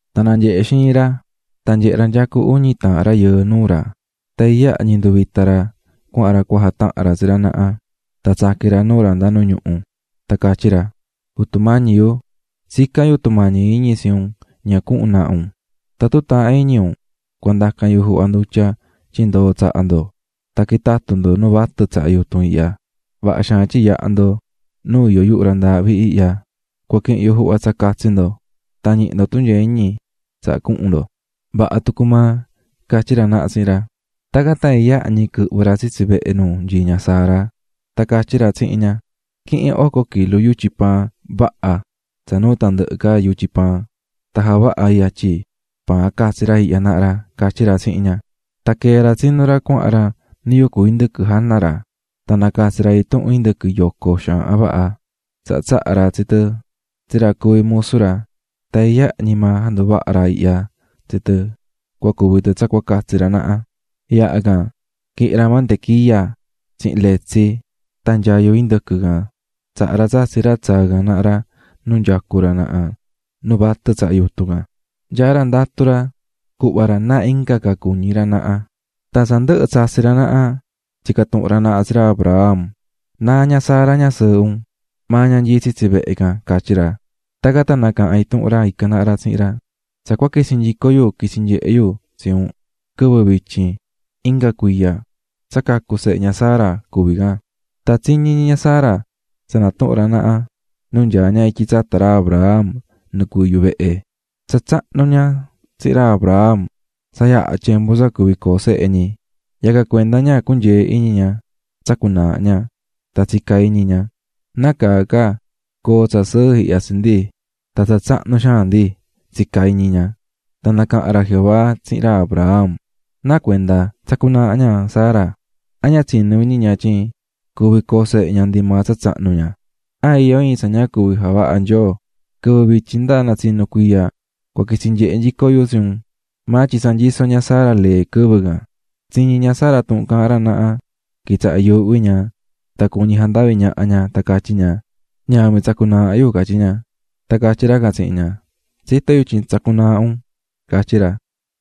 Tan nanyehe̱ xiin ra tan nyehe̱ ra nyacú uñi taahan rayɨɨ nuu ra. Tan iyaha ñi nduvita̱ ra cuahan ra cua jatahan ra tsi ra naha, tan tsaqui̱n ra nuu ra nda nu ñuhu. Tan catyí ra: --Jutu mañi yu, tsicán yu tumañi iñi tsi un ña cuhun naha ndo. Tatun taahán iñi un, cua ndacan yu juhva ndutya tyin ndoo tsaha ndo. Tan quitatu ndo nu vatɨ tsaha yutun ihya. Vaha xaan tyin yaha̱ ndo nu iyó yuhu ra ndaahvi ihya. Cua quihin yu juhva tsa catsi ndo tan ñihi ndo tunyee iñi tsaha cuhun ndo. --Vaha tucu maa --catyí ra naha tsihin ra. Tacan tan iyaha ñi quɨhvɨ̱ ra tsitsi vehe nu nyií ña Sara, tan catyí ra tsihin ña: --Qui̱hin oco kilu yutyi paan vaha tsa nuu tandɨhɨ ca yutyi paan, tan ja̱vaha yatyi paan catsi ra ihya naha --catyí ra tsihin ña. Tan quee̱ ra tsinú ra cuahan ra nu yucú indɨquɨ jana ra, tan nacatsi̱ ra intuhun indɨquɨ yoco xaahan vaha. Tsaha tsaha̱ ra tsi tɨ tsi ra cuví musu ra, tan iyaha ñi maa janduvaha̱ ra ihya tsi tɨ cua cuvi tɨ tsa catsi ra can naha ra. Yaha can quihi̱n ra mantequilla tsihin letsi tan nyayu indɨquɨ can tsaha̱ ra tsatsi̱ ra tsaa̱ can naha ra nu nyacú ra naha nu vatɨ tsaha yutun can. Nyaá ra ndatú ra cuhva ra náa inga ca cuñí ra naha ra. Tan tsa ndɨhɨ̱ tsatsi̱ ra naha tsica̱ tuhun ra naha tsi ra Abraham: --¿Náa ña Sara, ñasɨɨhɨ un? --Maa ña nyií tsitsi vehe can --catyí ra. Tacan tan nacaha̱n intuhun ra ican naha ra tsihin ra: --Tsa cua quitsi nyico yu quitsi nyehe yu tsi un quɨvɨ vityin inga cuiya, tsa cacu̱ sehe ña Sara. Tan tsiñí ñi ña Sara tsa natuhún ra naha nu nyaá ña ityi tsata ra Abraham nu cuví yuhu vehe. Tsa tsahnu ña Sara tsihin ra Abraham, tsa yaha̱ tyembu tsa cuvi coo sehe ñi. Yacan cuenda ña cunyee̱ iñi ña, tsacu̱ naaha ña tan tsica̱ iñi ña: "¿Nácaa ca coo tsa sɨɨ ihya tsi ndi, tan tsa tsahnu xaan ndi?" tsica̱ iñi ña. Tan nacaha̱n ra Jehová tsihin ra Abraham: --¿Náa cuenda tsacú naaha ña Sara? ¿An ña tsinú iñi ña tyin cuvi coo sehe ña ndi maa tsa tsahnu ña? ¿An iyó iin tsa ña cuvi javaha Nyoo? Quɨvɨ vityin nda natsinu cuiya cua quitsi nyehe nyico yu tsi un, tan tsa nyisó ña Sara lee tacan. Tsiñi̱ ña Sara tuhun caahán ra naha quitsaha̱ yuuhví ña tan cuñi̱ ña jandavi ñaha ña tan catyí ña: --Ñavin tsacú naaha yu --catyí ña. Tan catyí ra can tsihin ña: --Tsitó yu tyin tsacú naaha un --catyí ra.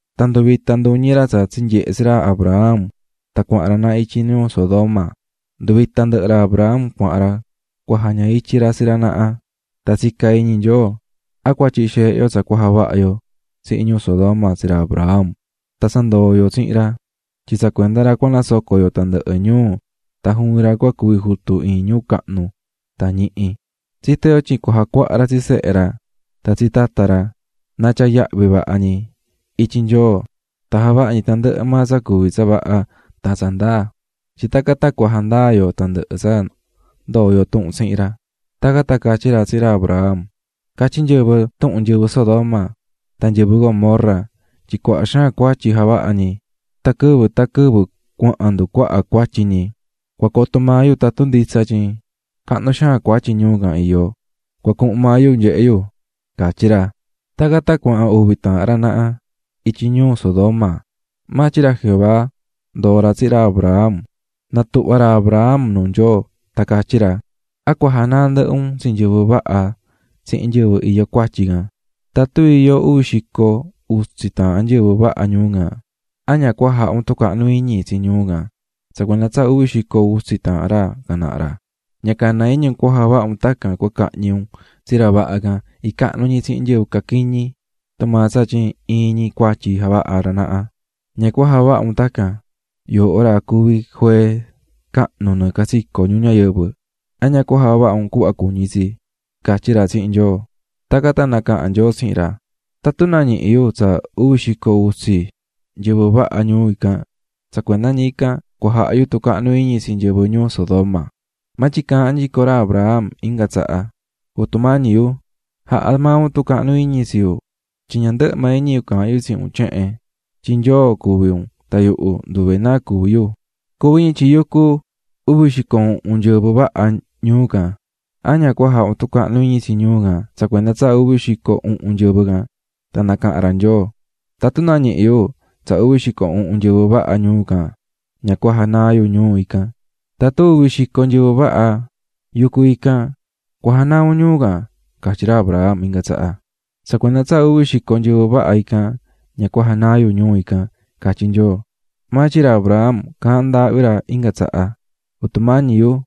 Tan nduvita̱ nduñi ra tsa tsinyehe̱ tsi ra Abraham tan cuahan ra naha ityi ñuu Sodoma, nduvita̱ ndɨhɨ ra Abraham cuahan ra cua jaña ityi ra tsi ra naha. Tan tsicá iñi Nyoo: "¿An cua tyihi xeehe yo tsa cua javaha yo tsihin ñuu Sodoma tsi ra Abraham, tan tsa ndoo̱ yo tsihin ra tyin tsa cuenda ra cua nasoco yo tandɨhɨ ñuu tan juvin ra cua cuvi jutu iin ñuu cahnu tan ñihi? Tsitó yo tyin cua jacuaha ra tsi sehe ra tan tsi tata ra, na tyaa yahvi vaha ñi ityi Nyoo tan javaha ñi tandɨhɨ maa tsa cuví tsa vaha tan tsa ndaa, tyin tacan tan cua jandaa yo tandɨhɨ tsa ndoo̱ yo tuhun tsihin ra." Tacan tan catyí ra tsihin ra Abraham: --Catyí nyɨvɨ tuhun nyɨvɨ Sodoma tan nyɨvɨ Gomorra tyin cuaha xaan cuatyi javahá ñi, tan quɨvɨ tan quɨvɨ cuahan nducuaha cuatyi ñi. Cua coto maa yu tatun nditsa tsa caahán nyɨvɨ tyin cahnu xaan cuatyi ñuu can iyó, cua cuhun maa yu cunyehe yu --catyí ra. Tacan tan cuahan uvi taahan ra naha ityi ñuu Sodoma, maa tyin ra Jehová ndoo̱ ra tsihin ra Abraham. Natuhva̱ ra Abraham nuu ra tan catyí ra: --¿An cua janaa ndɨhɨ un tsi nyɨvɨ vaha tsihin nyɨvɨ iyó cuatyi can? Tatun iyó uvi xico utsi taahan nyɨvɨ vaha ñuu can, ¿an ña cua jaha un tucahnu iñi tsi ñuu can tsa cuenda tsa uvi xico utsi taahan ra can naha ra? Ña cana iñi un cahñi un tsi ra vaha icahnu ñi tsihin nyɨvɨ caquiñi tumaa tsa tyin iyó ndɨhɨ cuatyi ñi. ¡Ña cana iñi un javaha un tacan, juee cahnu cuví un nɨɨ catsico ñuu ñayɨvɨ! ¿An ña cua javaha un cuhva cuñí tsi? --catyí ra tsihin Nyoo. Tacan tan nacaha̱n Nyoo tsihin ra: --Tatun nañihi yu uvi xico utsi nyɨvɨ vaha ñuu ican, tsa cuenda ñi ican cua jaha yu tucahnu iñi tsi nyɨvɨ ñuu Sodoma. Maa tyin caahán nyico ra Abraham inga tsaha: --Jutu mañi yu, ja̱ha maa un tucahnu iñi tsi yuhu tyin ña ndɨhɨ maa iñi yu caahán yu tsihin un tyehen, tyin Nyoo cuví un tan yuhu nduve náa cuví yu. Cuvi ñi tyin yucú uvi xico uhun nyɨvɨ vaha ñuu can, ¿an ña cua jaha un tucahnu iñi tsi ñuu can tsa cuenda tsa uvi xico uhun nyɨvɨ can? Tan nacaha̱n Nyoo: --Tatun nañihi yu uvi xico uhun nyɨvɨ vaha, ña cua janaa yu ñuu can. --Tatun iyó uvi xico nyɨvɨ vaha, ¿a cua janaa maa un ñuu ican? --catyí ra Abraham inga tsaha. --Tsa cuenda tsa uvi xico nyɨvɨ vaha, ña cua janaa yu ñuu ican --catyí Nyoo. Maa tyin ra Abraham caahán ndaahvi ra inga tsaha. --Jutu mañi yu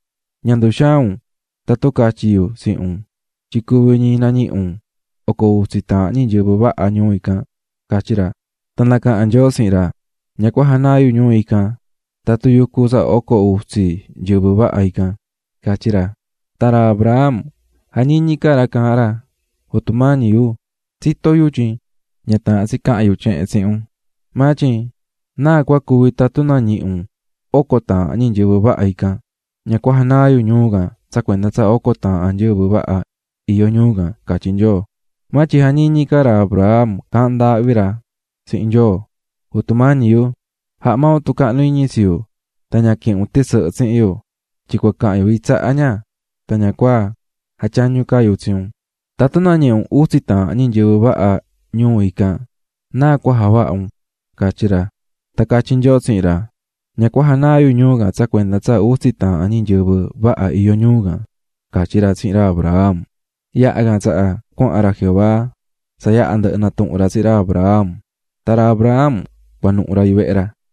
ña nduxaan un tatun catyi yu tsihin un tyin cuvi ñi cua nañihi un oco utsi taahan ñi nyɨvɨ vaha ñuu ican --catyí ra. Tan nacaha̱n Nyoo tsihin ra: --Ña cua janaa yu ñuu ican tatun iyó oco utsi nyɨvɨ vaha ican --catyí ra. Tan ra Abraham jañiñí ca ra caahán ra: --Jutu mañi yu, tsitó yu tyin ña taahán tsi cahan yu tyehen tsihin un, ña nacañi iñi maa un, maa tyin ¿náa cua cuvi tatun nañihi un oco taahan ñi nyɨvɨ vaha. --Ña cua janaa yu ñuu can tsa cuenda tsa oco taahan nyɨvɨ vaha ican --catyí Nyoo. Maa tyin jañiñí ca maa ra Abraham caahán ndaahvi ra tsihin Nyoo: --Jutu mañi yu, jaha maa un tumañi iñi tsi yu tan ña quihin un tɨsɨhɨ tsihin yu, tyin cua cahan yu iin tsaha ña tan ña cua jatyañu ca yu tsi un. ¿Tatun nañihi un utsi taahan ñi nyɨvɨ vaha ñuu ican náa cua javaha un? --catyí ra. Tan catyí Nyoo tsihin ra: --Ña cua janaa yu ñuu can tsa cuenda tsa utsi taahan ñi nyɨvɨ vaha ican --catyí ra tsihin ra Abraham. Yaha can tsaha cuahan ra Jehová tsa yaha ndɨhɨ natuhu̱n ra tsihin ra Abraham, tan ra Abraham cuanuhu̱ ra yuvehe ra.